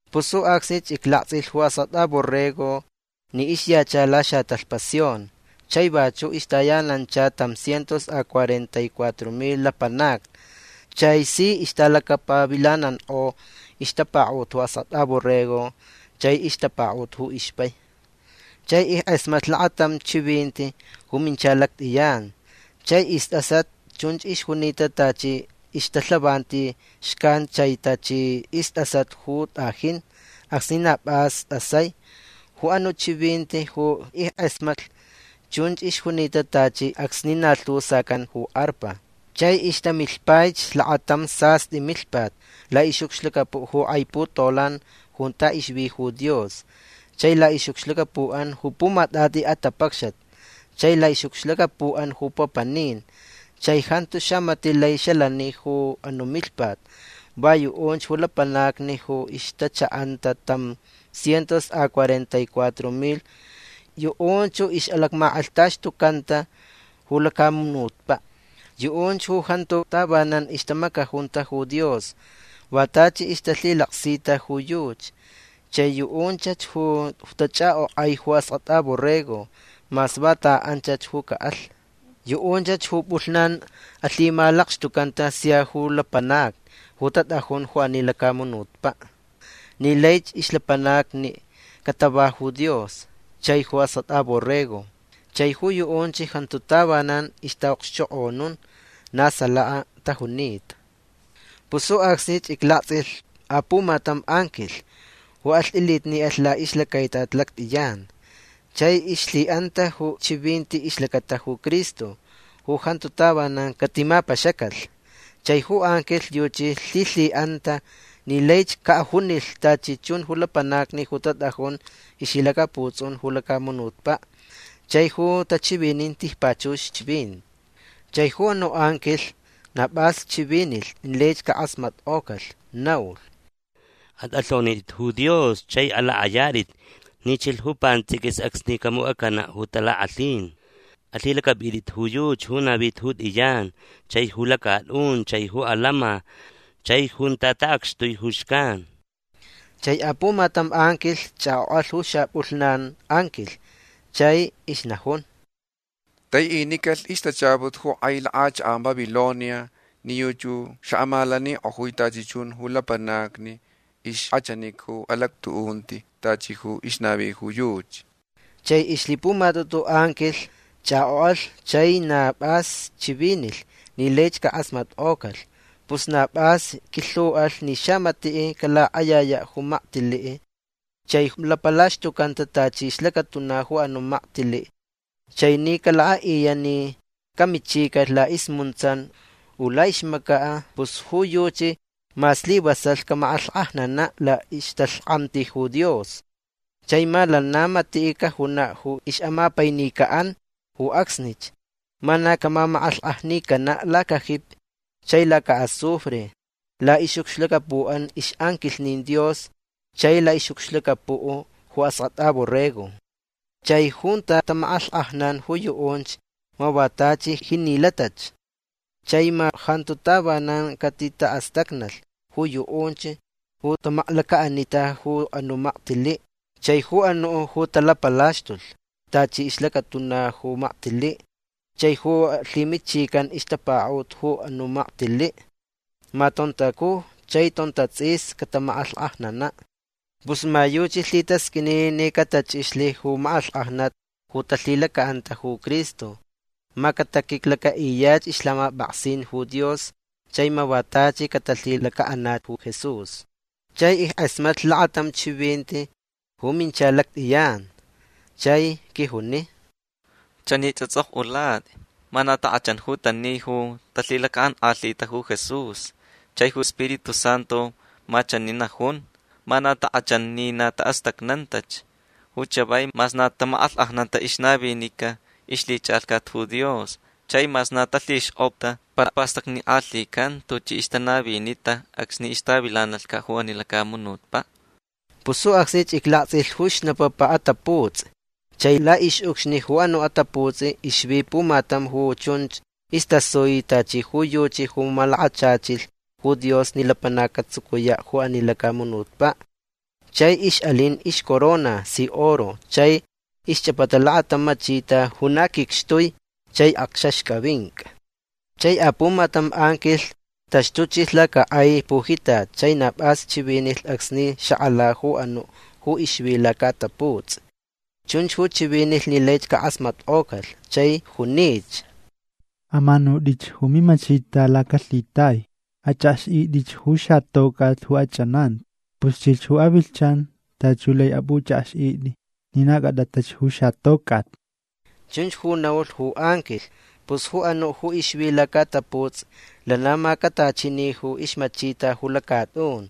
Pus ju acsnich iclaktsʼilh ju Askʼatʼa Borrego ni ixyacha laxatalhpa Sion. Chai vachuʼ ixtayanancha tam cientos a cuarenta y cuatro milh lapanacni. Chai si ixtalacapavilanankʼo ixtapakaʼut ju Askʼatʼa Borrego chai ixtapakaʼut ju ixpai. Chai ickʼasmatlh lakatam chivinti ju mincha lactʼiyan. Chai istʼasat chunch ixjunita tachi ixtalhavanti xcan chai tachi istʼasat ju tʼajin acsni na pʼas tʼasai. Ju anuʼ chivinti ju ickʼasmatlh chunch ixjunita tachi acsni na lhu sacan ju arpa. Chai ixtamilhpaich lakatam sastʼi milhpat laʼixʼucxlacapuʼ ju kʼai putolan junta ixvi ju Dios chai laʼixʼucxlacapuʼan ju pumatʼatʼi atapacxat chai laʼixʼucxlacapuʼan ju papanin. Chai jantu xamatiʼ lai xalani ju anuʼ milhpat. Va yuʼunch ju lapanacni ju ixtachaʼanta tam cientos a cuarenta y cuatro milh. Yuʼunch ju ixʼalacmakʼalhtaxtucanta ju lacamunutpaʼ. Yuʼunch ju jantu tavanan ixtamacajunta ju Dios. Va tachi ixtalhilaksita ju yuchi. Chai yuʼunchach ju tachʼakʼokʼai ju Askʼatʼa Borrego mas vanta anchach ju caʼalh. Yuʼunchach ju pʼulhnan alhimalakxtucanta sia ju lapanacni ju tatʼajun ju ani lacamunutpaʼ ni laich ixlapanacni catava ju Dios chai ju Askʼatʼa Borrego. Chai ju yuʼunch jantu tavanan ixtaʼaʼokxchokʼonun. Na salaka tajunita. Pus ju acsnich iclaktsʼilh apumatam anquilh ju alhtʼilitniʼalh laʼixlacaitat lactʼiyan. Chai ixlhiʼanta ju chivinti ixlacata ju Cristo ju jantu tavanan catimapaxacalh. Chai ju anquilh yuchi lhilhiʼanta ni laich caʼajunilh tachi chun ju lapanacni ju tatʼajun ixlhilacaputsʼun ju lacamunutpaʼ chai ju tachivinin tijpachux chivinti. Chai ju anuʼ anquilh na pʼas chivinilh ni laich cakʼasmatkʼocalh. Naulh: ―Atʼalhonitʼit ju Dios chai alakʼayatʼit ni chilh ju pantsʼiquis acsni camucʼacanaʼ ju talakʼalhin. Alhilacʼapʼitʼit ju yuchi ju navita ju tʼiyan chai ju lacatʼun chai ju alama chai junta taʼacxtui ju xcan. Chai apumatam anquilh chʼakʼokʼalh ju xapʼulhnan anquilh. Chai ixnajun: ―Taiʼinicalh ixtachaput ju kʼai lakʼachakʼan Babilonia ni yuchi ju xaʼamalanikʼojui tachi chun ju lapanacni ixkʼachanica ju alactuʼunti tachi ju ixnavi ju yuchi. Chai ixlhipumatʼutu anquilh chʼakʼokʼalh chai na pʼas chivinilh ni laich cakʼasmatkʼocalh. Pus na pʼas quilhuʼalh ni xamatiʼ calakʼayayaʼ ju maktiliʼ chai ju lapalaxtucanta tachi ixlacatuna ju anuʼ maktiliʼ chai ni calakʼaʼiyaʼ ni camichicalh laʼismuntsan u laʼixmacaʼ pus ju yuchi ma slivasalh camakʼalhkʼajnanaʼ laʼixtalhkʼamti ju Dios. Chai ma lana matiʼ cajunaʼ ju ixʼamapainicaʼan ju acsnich. Ma na camamakʼalhkʼajnicanaʼ lacajipi chai lacaʼazufre laʼixʼucxlacapuʼan ixʼanquilhnin Dios chai laʼixʼucxlacapuʼ ju Askʼatʼa Borrego. Chai junta tamakʼalhkʼajnan ju yuʼunch ma va tachi jinilatach. Chai ma jantu tavanan catitaʼastacnalh ju yuʼunch ju tamaklacaʼanita ju anuʼ maktiliʼ chai ju anuʼ ju talapalaxtulh tachi ixlacatuna ju maktiliʼ chai ju alhimichicanta ixtapakaʼut ju anuʼ maktiliʼ. Ma tontacuj chai tontatsʼis catamakʼalhkʼajnanaʼ. Pus ma yuchi lhitasqʼuini ni catachʼixlh ju makʼalhkʼajnat ju talhilacaʼanta ju Cristo. Ma cataquiclacaʼiyach ixlhamapʼaksin ju Dios chai ma va tachi catalhilacaʼanaʼ ju Jesús. Chai ickʼasmatlh lakatam chivinti ju minchalh lactʼiyan. Chai quijuni: ―Chanich atsʼokʼulatʼi: “Ma na takʼachan ju tani ju talhilacaʼankʼalhita ju Jesús”. Chai ju Spiritu Santu ma chani najun: “Ma na takʼachan ni taʼastacnantach ju chavai mas na tamakʼalhkʼajnanta ixnavinica ixlhichʼalhcat ju Dios chai mas na talhixkʼopta. Para pastacnikʼalhican tuchi ixtanavinita acsni ixtavilanalhcaʼ ju ani lacamunutpaʼ”. Pus ju acsnich iclaktsʼilh ju xnapapa ataputsʼi. Chai laʼixʼucxni ju anuʼ ataputsʼi ixvi pumatam ju chunch istasui tachi ju yuchi ju malakachachilh ju Dios ni lapanac catsucuyaʼ ju ani lacamunutpaʼ. Chai ixʼalin ixcorona si oro chai ixchʼapata lakatam machita ju na quicxtui chai akxaxcʼavincʼa. Chai apumatam anquilh taxtuchilh lacakʼai pujitat chai na pʼas chivinilh acsni xakʼala ju anuʼ ju ixvi lacaʼataputsʼi. Chunch ju chivinilh ni laich cakʼasmatkʼocalh. Chai junich: ―Amanutʼich ju mimachita lacalhitai. Achʼakxʼitʼich ju xatocʼat ju achʼananti. Pus chilh ju avilhchan tachi ju lai apʼuchʼakxʼitʼi ni na cʼatʼatach ju xatocʼat. ―Chunch ju naulh ju anquilh. Pus ju anuʼ ju ixvi lacaʼataputsʼi lana macatachini ju ixmachita ju lacatʼun.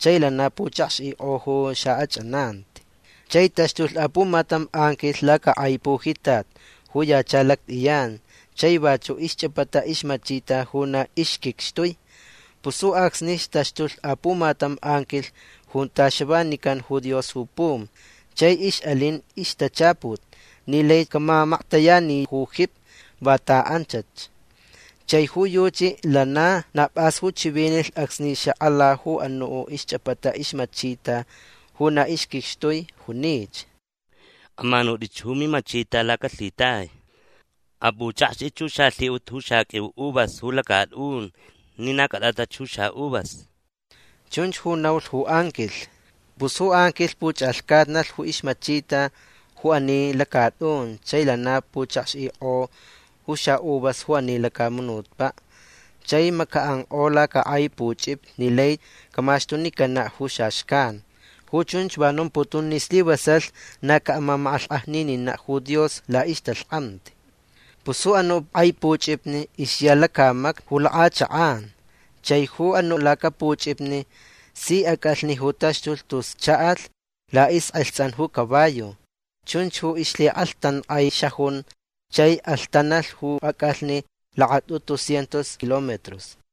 Chai lana puchakxʼikʼo ju xaʼachʼananti. Chai taxtulh apumatam anquilh lacakʼai pujitat ju yacha lactʼiyan. Chai vachuʼ ixchʼapata ixmachita ju na ixquicxtui. Pus ju acsnich taxtulh apumatam anquilh junta xavanican ju Dios ju pum. Chai ixʼalin ixtachaput ni lai camamactayani ju jipi vanta anchach. Chai ju yuchi lana na pʼas ju chivinilh acsni xakʼala ju anuʼ ixchʼapata ixmachita ju na ixquicxtui. Junich: ―Amanutʼich ju mimachita lacalhitai. Apʼuchʼakxtʼich ju xalhiʼut ju xaqʼuiu uvas ju lacatʼun ni na cʼatʼatach ju xaʼuvas. ―Chunch ju naulh ju anquilh. Pus ju anquilh puchʼalhcatnalh ju ixmachita ju ani lacatʼun chai lana puchakxʼikʼo ju xaʼuvas ju ani lacamunutpaʼ. Chai macaʼankʼo lacakʼai puchʼipni ni lai camaxtunicanaʼ ju xaxcan. Ju chunch va nomputun ni slivasalh na caʼamamakʼalhkʼajnininaʼ ju Dios laʼixtalhkʼamti. Pus ju anuʼ kʼai puchʼipni ixya lacamacni ju lakʼachakʼan. Chai ju anuʼ lacapuchʼipni si acʼalhni ju taxtulh tus chaʼalh laʼixkʼalhtsan ju caballo. Chunch ju ixlhikʼalhtankʼai xajun. Chai alhtanalh ju acʼalhni lakatʼutu cientos kilómetros.